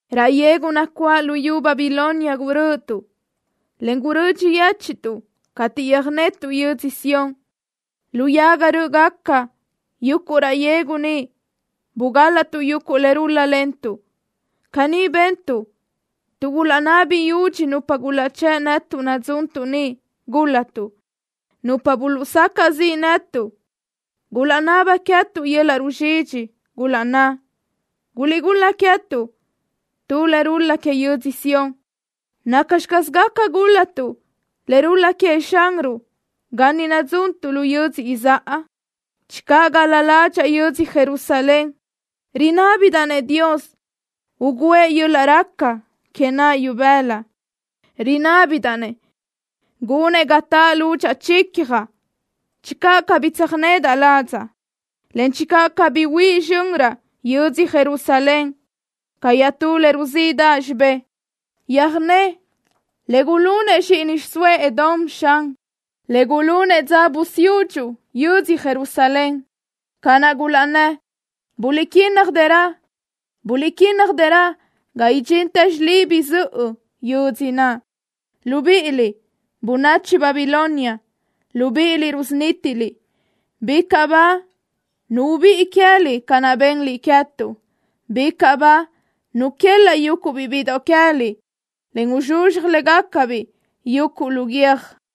Raʼ yegu nacuáʼ lu yu Babilonia gurö́ʼötuʼ, en gurödxi yéchiʼtuʼ, cateʼ yöjnetuʼ yödzö Sión. Lu yaga rö́ʼgaca yuguʼ raʼ yegu niʼ bugálaʼtuʼ yuguʼ le rúl-lalentuʼ. Caní bentuʼ tuʼ gulaʼnabi yudxi nupa gulachë́ʼ netuʼ nadzuntuʼ niʼ gúl-latuʼ. Nupa buluʼsacaʼ ziʼ netuʼ gulaʼnaba queë́tuʼ yöl-laʼ ruzxidxi, gulaʼnná: “Guliʼgul-la queë́tuʼ tu le rul-la que yödzö Sión.” ¿Nacxi caz gaca gúl-latuʼ le rul-la queëʼ Xanruʼ ga ni nadzuntuʼ tu lu yödzö izáʼa? Channö gal-la ládxaʼa yödzö Jerusalén, rinábidaʼ-nëʼ Dios ugǘëʼ yöl-laʼ raca que naʼa ibëla. Rinábidaʼ-nëʼ gunëʼ ga taʼ lúdxaʼa chichjaʼ channö cabí tsöjnedaʼ ladzaʼ, en channö cabí huíʼ zxönraʼ yödzö Jerusalén ca iaʼtú le ruzíʼidaʼ xibé. Yöjné le gulunëʼ zxíʼini xiʼsóëʼ Edom, Xan, le gulunëʼ dza busiúdxuʼ yödzö Jerusalén, ca naʼ gulaʼnnë́ʼ: “Guliʼquínnaj dëra. Guliʼquinnaj dëra ga idxintë xilibi zöʼö yödzö naʼ.” Libíʼiliʼ, bönachi Babilonia, libíʼiliʼ rusunítiliʼ, bicaʼ ba nu ubíʼi queë́liʼ ca naʼ benliʼ queë́tuʼ. Bicaʼ ba nu quelaʼ yuguʼ bíʼidoʼ queë́liʼ en uzxuzxaj légacabiʼ yuguʼ lu guiö́j.